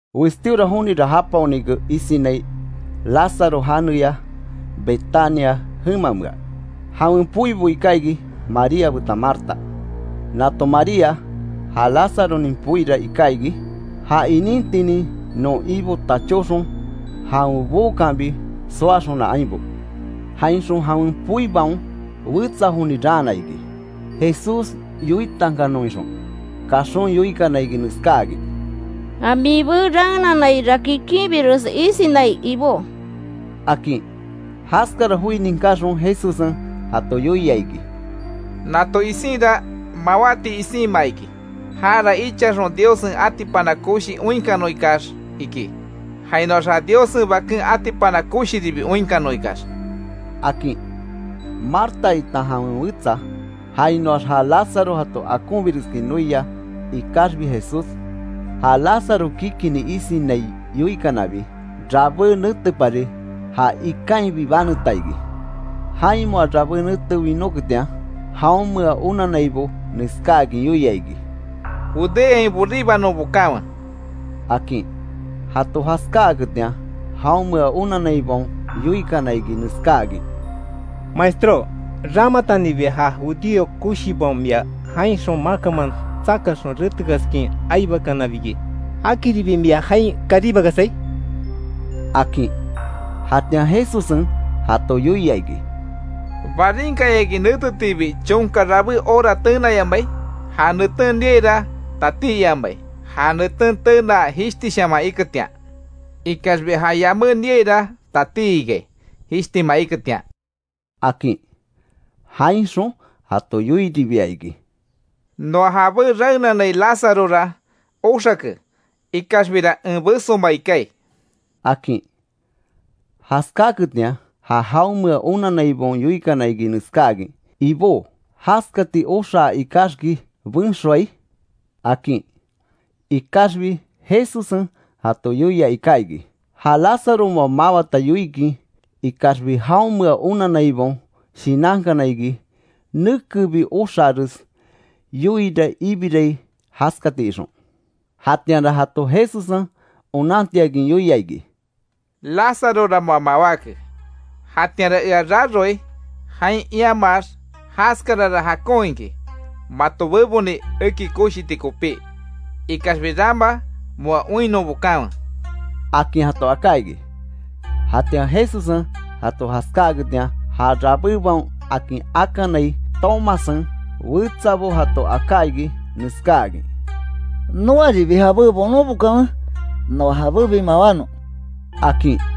Westíora jonira japaonike isinai Lazaro janeya Betania jemamea, jawen poibo iká iki María betan Marta. Nato María ja Lázaronin poira iká iki, ja inintinin non Ibo tachóxon jawen bookanbi soaxona ainbo. Jainxon, jawen poibaon wetsa joni raana iki, Jesús yoitankanon ixon, kaxon yoikana iki neskáakin: —Ja mibé raenanaira kikinbiresi isinai lbó —akin. Jaskara joi ninkaxon Jesussen jato yoia iki: —Nato isinra, mawáti isinma iki. Jara ichaxon Diossen atipana koshi oinkanon ikax iki, jainoax ja Diossen Baken atipana koshiribi oinkanon ikax —akin. Marta itan jawen wetsa, jainoax ja Lazaro jato akonbireskin noia, ikaxbi Jesús ja Lazaro kikini isinai yoikanabi, rabé netepari ja ikainbi baneta iki. Jain moa rabé nete winóketian, jaonmea onannaibo neskáakin yoia iki: —Judeain boribanon bokanwe —akin. Jato jaskáaketian, jaonmea onanaibaon yoikana iki neskáakin: —Maestró ramatanibi ja judío koshibaon mia jainxon makanman tsakaxon retekaskin aibakanabiki, ¿Jakiribi mia jain karíbakasai? —akin. Jatian Jesussen jato yoia iki: —¿Barinkayaki netetiibi chonka rabé hora tenayamai? Ja neten niaira tatí iamai ja neten tenaa jishtishaman iketian. Ikaxbi ja yamé niaira tatí ikai, jishtima iketian —akin. Jainxon jato yoiribia iki: —Noa jabé raenanai Lázarora oxake, ikaxbira en besomai kaai —akin. Jaskaketian, ja jaonmea onanaibaon yoikana iki neskáakin: —Ibó, jaskati oxaa ikaxki benxoai —akin. Ikaxbi Jesussen jato yoia iká iki, ja Lazaro moa mawata yoikin, ikaxbi jaonmea onanaibaon shinankana iki, nekebi oxaares yoiira ibirai jaskati ixon. Jatianra jato Jesussen onantiakin yoia iki: —Lázarora moa mawáke. Jatianra ea raroai jain iamaax, jaskarara jakon iki mato beboni eki koshiti kopí. Ikaxbi rama moa oinnon bokanwe —akin jato aká iki. Jatian Jesussen jato jaskáaketian, ja Rabébaon akin akanai Tomassen, wetsabo jato aká iki, neskáakin: —Noaribi jabé bonon bokanwe, noa jabébi mawánon —akin.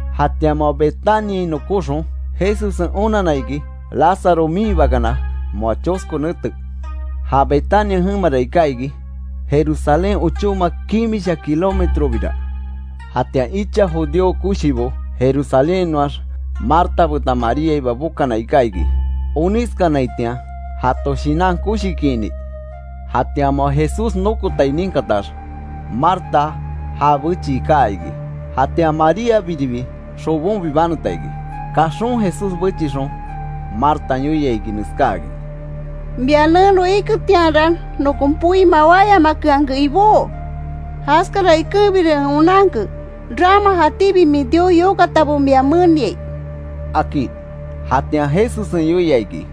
Jatian moa Betaniain nokóxon Jesussen onanna iki, Lazaro miinhibakana moa chosko nete. Ja Betania jemara iká iki, Jerusalén ochóma kimisha kilómetrobira. Jatian icha judío koshibo Jerusalénhainoax, Marta betan Mariaiba bokana iká iki, onískanaitian jato shinan koshikiini. Jatian moa Jesús nokotai ninkatax, Marta já bechii kaa iki. Jatian Maríabiribi, xobonbi baneta iki. Kaxon Jesús bechixon, Martan yoia iki neskáakin: —Mia neno iketianra, nokon poi mawáyamakeanke Ibó. Jaskara ikenbira en onanke, rama jatíbi min Dios yokatabo mia meniai —akin. Jatian Jesussen yoia iki: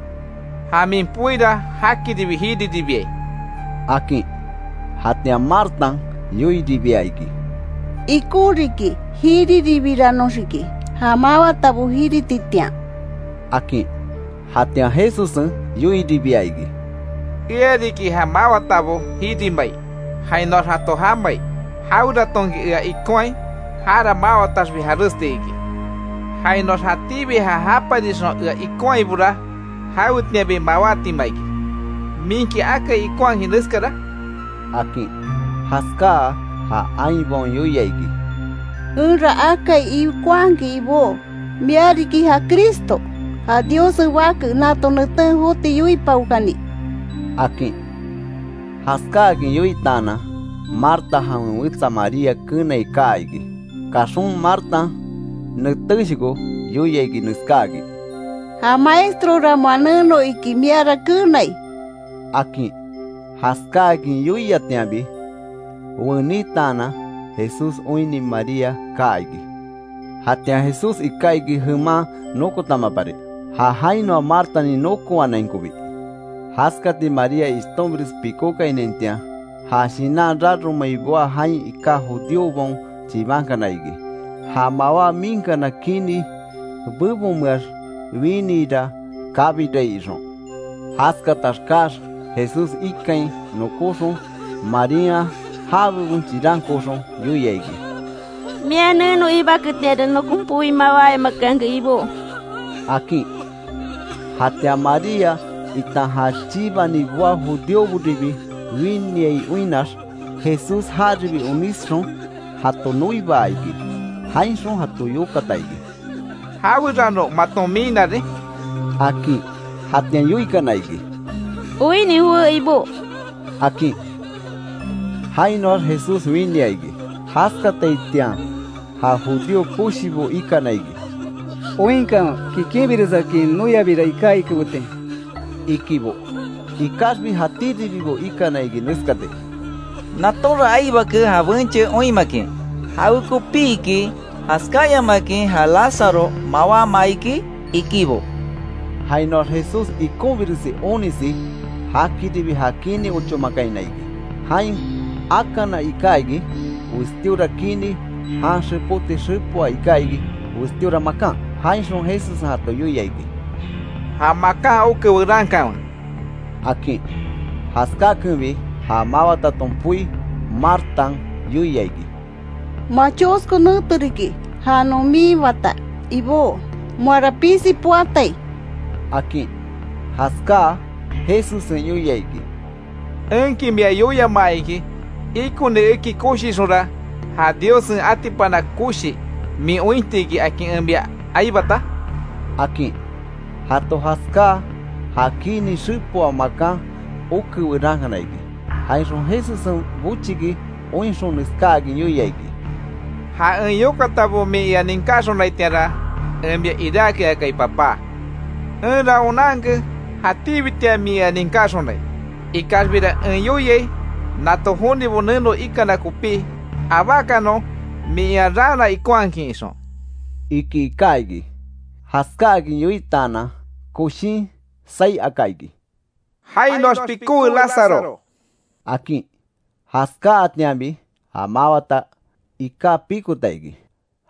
—Ja min poira jakiribi jiriribiai —akin. Jatian Martan yoiribia iki: —Ikon riki jiriribiranoxiki, ja mawatabo jirititian —akin. Jatian Jesussen yoiribia iki: —Ea riki ja mawatabo jirimai, jainoax jato jamai. Jaweratonki ea ikonhai jara mawataxbi jaresti iki. Jainoax jatíbi ja japarixon ea ikonhaibora jawetianbi mawátima iki, ¿Minki akai ikonhakin neskara? —akin. Jaskáa ja ainbaon yoia iki: —Enra akai ikonhakin Ibó, mia riki ja Cristo, ja Diossen Bake nato neten joti yoipaokani —akin. Jaskáakin yoitaanan, Marta jawen wetsa María kenai kaa iki. Kaxon Martan netéshoko yoia iki neskáakin: —Ja maestrora moa neno, iki miara kenai —akin. Jaskáakin yoiatianbi wenítaanan, Jesús oinni María kaa iki. Jatian Jesús iká iki jeman nokotamapari, ja jainoa Martan nokowanainkobi. Jaskati María ishtonbires pikókainaitian, ja shinan raromai boá jain iká judíobaon chibankana iki, ja mawá miinkana kini bebonmeax winiira kabirai ixon. Jaskatax kaax Jesús ikain nokóxon, Marían ja bebon chirankooxon yoia iki: —Mia neno iibaketianra, nokon poi mawáyamakeanke Ibó —akin. Jatian María itan ja chibani boá judíoboribi winiai oinnax, Jesús jaribi onísxon jato noibaa iki. Jainxon jato yokata iki: —¿Jawerano maton miinarin? —akin. Jatian yoikana iki: —Oinni jowé Ibó —akin. Jainoax Jesús winia iki. Jaskataitian ja judío koshibo ikana iki: —¡Oinkanwe kikinbiresakin noiabira iká ikibetin! —ikibo. Ikaxbi jatíribibo ikana iki neskati: —Natonra aibake ja benche oinmakin ¿Jawekopiki jaskáayamakin ja Lazaro mawámaa iki? —ikibo. Jainoax Jesús ikonbiresi onisi jakiribi ja kini ochómakaina iki. Jain akana iká iki, westíora kini, jan xepóti xepoa iká iki westíora makan. Jainxon Jesussen jato yoia iki: —Ja makan oke werankanwe —akin. Jaskakenbi, ja mawataton poi, Martan yoia iki: —Moa chosko nete riki, ja non miinbata Ibó, moara pisi poatai —akin. Jaskáa Jesussen yoia iki: —¿Enki mia yoiamaa iki, ikoni eki koshixonra, ja Diossen atipana koshi min ointi iki, akin en mia aibata? —akin. Jato jaskáa ja kini xepoa makan oke werankana iki. Jainxon Jesussen bochiki oinxon neskáakin yoia iki: —Ja en yokatabo min ea ninkáxonaitianra en mia iráke akai Papá. Enra onanke, jatíbitian min ea ninkaxonai. Ikaxbira en yoiai nato jonibo neno ikana kopí, abákanon min ea raana ikonhakin ixon —iki iká iki. Jaskáakin yoitaanan koshin saí aka iki: —¡Jainoax pikówe Lazaro! —akin. Jaskáatianbi ja mawata iká pikota iki,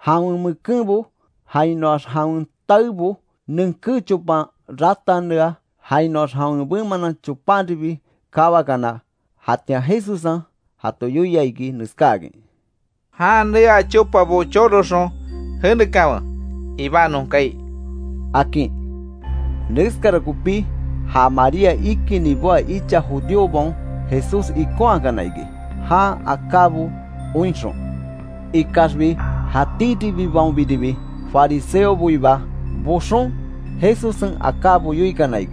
jawen mekenbo jainoax jawen taebo nenké chopan ratanea jainoax jawen bemanan chopanribi kawakana; jatian Jesussen jato yoia iki neskáakin: —Jan neaa chopabo choroxon jenekanwe, ibanon kaai —akin. Neskara kopí ja María ikinni boá icha judíobaon Jesús ikonhaakana iki, jan akábo oinxon. Ikaxbi jatíribibaonbiribi fariseoboiba boxon Jesussen akábo yoikana.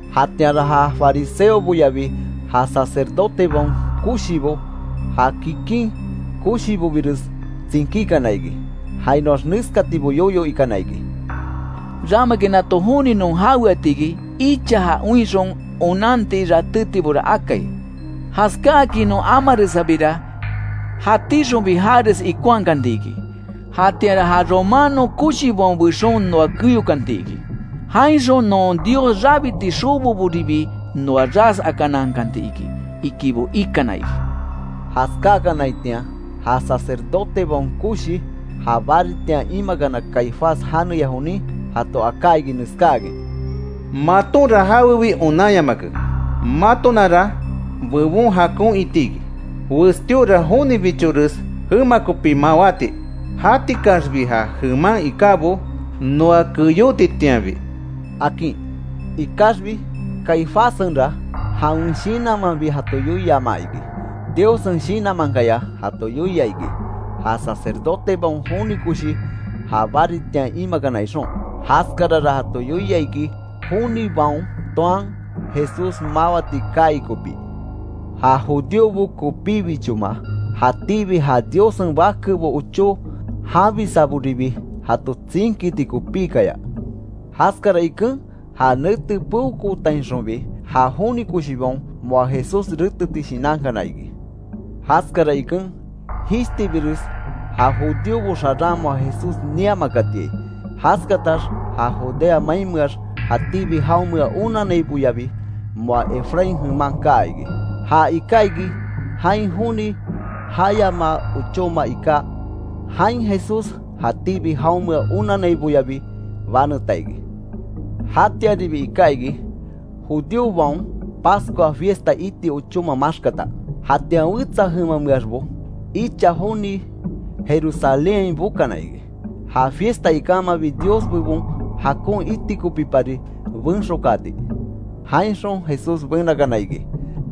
Jatianra ja fariseoboyabi ja sacerdotebaon koshibo, ja kikin koshibobires tsinkíkana iki, jainoax neskatibo yoyo ikana iki: —¿Ramaki nato joni non jaweatiki? Icha ja oinxon onanti ratétibora akai, jaskáakin non amaresabira, jatíxonbi jares ikonhakantiki. Jatianra ja romano koshibaon bexon noa keyokanti iki. Jainxon non Dios rabiti xoboboribi noa ras akanankanti iki —ikibo ikana iki. Jaskakanaitian ja sacerdotebaon koshi, ja baritian imakana Caifás janeya jonin, jato aká iki neskáakin: —Matonra jawebi onanyamake. Matonara bebon jakon iti iki, westíora jonibichores jema kopi mawáti. Jatikaxbi ja jeman ikábo noa keyótitianbi —akin. Ikaxbi Caifássenra, jawen shinanmanbi jato yoiama iki, Diossen Shinanmankaya jato yoia iki, ja sacerdotebaon joni koshi ja baritian imakana ixon. Jaskarara jato yoia iki jonibaon toan Jesús mawati kaai kopí. Ja judíobo kopíbichoma, jatíbi ja Diossen bakebo ochó janbisaboribi jato tsinkiti kopíkaya. Jaskara iken ja nete peokootainxonbi ja joni koshibaon moa Jesús reteti shinankana iki. Jaskara iken, jishtibires ja judíobo xaran moa Jesús niamakatiai. Jaskatax ja Judea mainmeax jatíbi jaonmea onanaiboyabi moa Efraín jeman kaa iki, ja iká iki, jain joni jayamaa ochóma iká. Jain Jesús jatíbi jaonmea onanaiboyabi baneta iki. Jatianribi iká iki, judíobaon Pascua fiesta iti ochóma maxkata. Jatian wetsa jemameaxbo icha joni Jerusalénhain bokana iki, ja fiesta ikamabi Dios bebon jakon iti kopípari benxokaati. Jainxon Jesús benakana iki.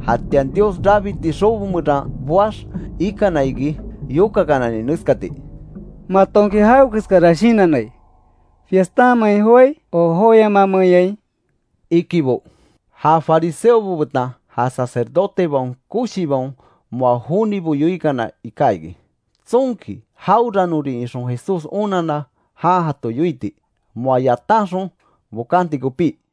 Jatian Dios rabiti xobo meran boax ikana iki yokakanani neskati: —¿Matonki jawekeskara shinannai? Fiestanmein joái o joyamamenyai —ikibo. Ja fariseobo betan ja sacerdotebaon koshibaon moa jonibo yoikana iká iki, tsonki jaweranorin ixon Jesús onanna jan jato yoiti, moa yatanxon bokanti kopí.